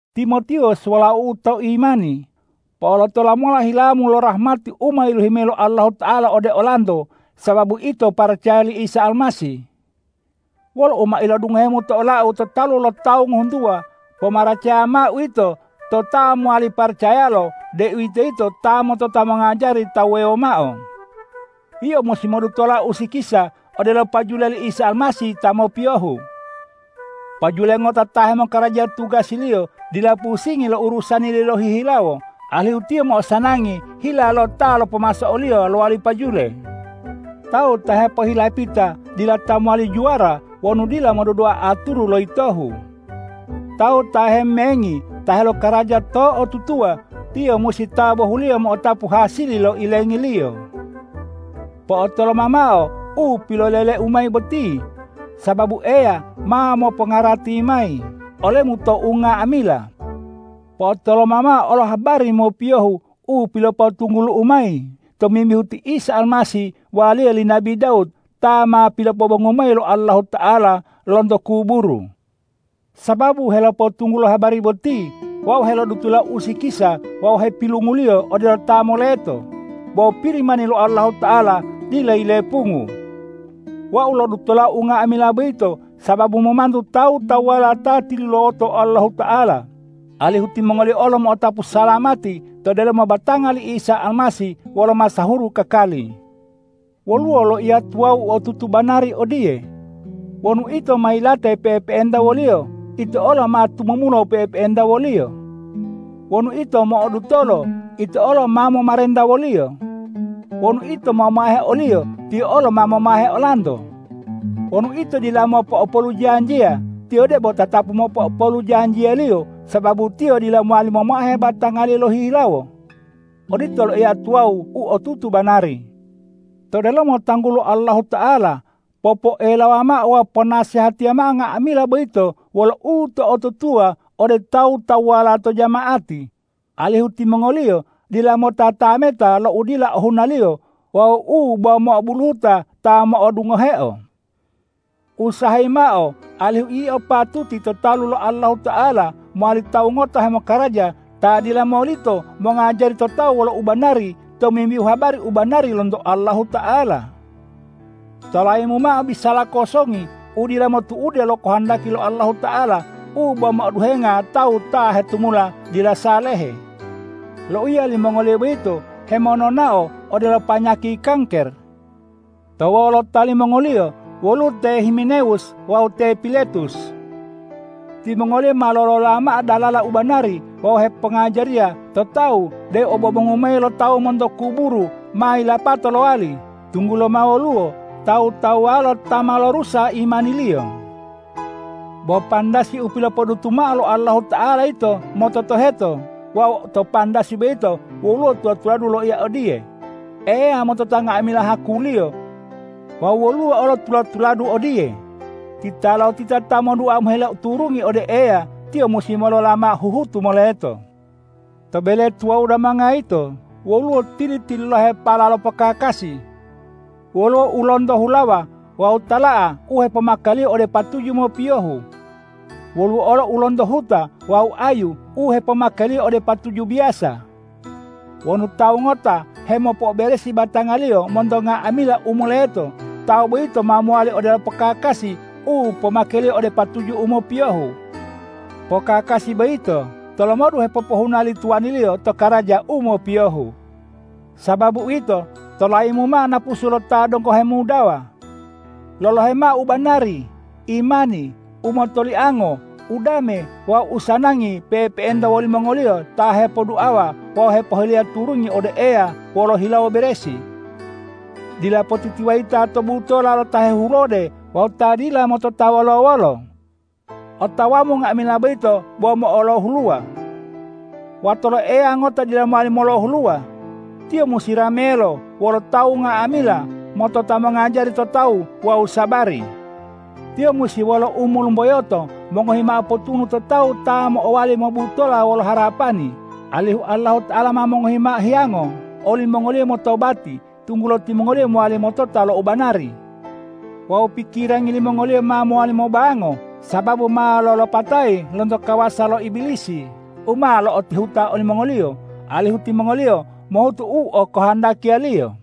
Timotiwus walau'u to imani, po'olotola mola hilamu lo rahmati u ma yilohi mayi lo Allahuta'ala ode olanto sababu ito paracaya li Isa Almasih. Wolo u ma ilodungohemu to olau to talu lo tawu ngohuntuwa, pomaracaya mao uwito to ta mowali paracayalo, deuwitoyito ta motota mongajari tawu wuwewo mao. Yio musi modutola usikisa odelo pajule li Isa Almasih ta mopiyohu. Pajule ngota ta hemokaraja tugasiliyo dila pusingi lo urusaniliyo lohihilawo, alihu tiyo mo'osanangi hila lo ta lopomaso oliyo lowali pajule. Tawu ta hepohilapita dila ta mowali juwara wonu dila modudua aturu lo yitohu. Tawu ta hemengi ta helokaraja to'otutuwa, tiyo musi ta bohuliyo mo'otapu hasili lo ilengiliyo. Po'otoloma mao u piloleleu mayi boti, sababu Eya ma mopongarati mayi olemu to unga'amila. Po'otoloma mao olo habari mopiyohu u pilopotunggulu'u mayi tomimbihu ti Isa Almasih waliya li nabi Dawud, ta ma pilopobongu mayi lo Allahuta'ala lonto kuburu. Sababu helopotunggulo habari boti, wau helodutola usikisa wawu hepilunguliyo odelo ta moleto, bo Pirimani lo Allahuta'ala dila yilepungu. Wau lodutola unga'amila boyito sababu momantu tawu-tawuwala ta tilulawoto Allahuta'ala, alihu timongoliyo olo mo'otapu salamati to delomo batanga li Isa Almasih wolo masahuru kakali. Woluwo loiya tuwawu u otutu banari odiye: Wonu ito ma yilate pe'epe'enta wo-Liyo, ito olo ma tumumula pe'epe'enta wo-Liyo. Wonu ito mo'odutolo, ito olo ma momarenta wo-Liyo. Wonu ito momahe o-Liyo, Tiyo olo ma momahe olanto. Wonu ito dila mopo'opolu janjiya, Tiyo debo tatapu mopo'opolu lo janjiya-Liyo, sababu Tiyo dila mowali momahe batanga-Liyo lohihilawo. Odito loiya tuwawu u otutu banari. To delomo tanggulo Allahuta'ala, popoelawa mao wawu ponasehatiya mao unga'amila boyito wolo uto'otutuwa ode tawu-tawuwala to jama'ati, alihu timongoliyo dila motatameta lo u dila ohunaliyo wawu u bo mo'obuluhuta ta mo'odungoheo. Usahayi mao alihu yio patuti to talu lo Allahuta'ala mowali tawu ngota hemokaraja ta dila molito mongajari to tawu wolo ubanari tomimbihu habari u banari lonto Allahuta'ala. Tolayimu mao bisala kosongi u dila motu'ude lo kohondaki lo Allahuta'ala u bo mo'oduhenga tawu ta hetumula dila salehe. Loiya limongoliyo boyito hemononao odelo panyaki kangker. To wolota limongoliyo woluwo te Himenewus wawu te Piletus. Timongoliyo ma lolola mao dalala u banari wawu hepongajariya to tawu deu obobongu mayi lo tawu monto kuburu ma yilapato lowali, tunggulo ma woluwo tawu-tawuwala ta ma lorusa imaniliyo. Bo pandasi u pilopodutu mao lo Allahuta'ala yito mototoheto wawu to pandasi boyito woluwo tula-tuladu loiya odiye,”Eya motota nga'amila haku-Liyo.” Wawu woluwo olo tula-tuladu odiye,”Titalotita ta modua mohile turungi ode Eya, tiyo musi molola mao huhutu moleto.” To bele tuwawu damanga yito woluwo tili-tililahepala lo pokakasi. Woluwo u lonto hulawa wawu tala'a u hepomakeliyo ode patuju mopiyohu. Woluwo olo u lonto huta wawu ayu u hepomakeliyo ode patuju biyasa. Wonu tawu ngota hemopo'oberesi batangaliyo monto nga'amila u moleto, tawu boyito ma mowali odelo pokakasi u pomakeliyo ode patuju u mopiyohu. Pokakasi boyito tolomodu hepopohuna li tuwaniliyo to karaja u mopiyohu. Sababu uwito, tolayimu mao napusu lo ta donggo hemudawa. Lolohe mao u banari, imani, umotoliango, udame wawu usanangi pe'epe'enta wolimongoliyo ta hepoduawa wawu hepohileya turungi ode Eya wolo hilawo beresi. Dila potitiwayita to butola lo ta hehulode wawu ta dila motota wolo-wolo. Otawamu nga'amila boyito bo mo'olohuluwa. Wato lo Eya ngota dila mowali molohuluwa. Tiyo musi ramelo wolo tawu nga'amila, motota mongajari to tawu wawu sabari. Tiyo musi wolo umolumboyoto mongohi mao potunu to tawu ta mo'owali mobutola wolo harapani, alihu Allahuta'ala ma mongohi mao hiyango olimongoliyo motobati, tunggulo timongoliyo mowali motota lo u banari. Wawu pikirangi limongoliyo ma mowali mobango, sababu ma lolopatayi lonto kawasa lo Ibilisi u ma lo'otihuta olimongoliyo, alihu timongoliyo mohutu u okohondakiliyo.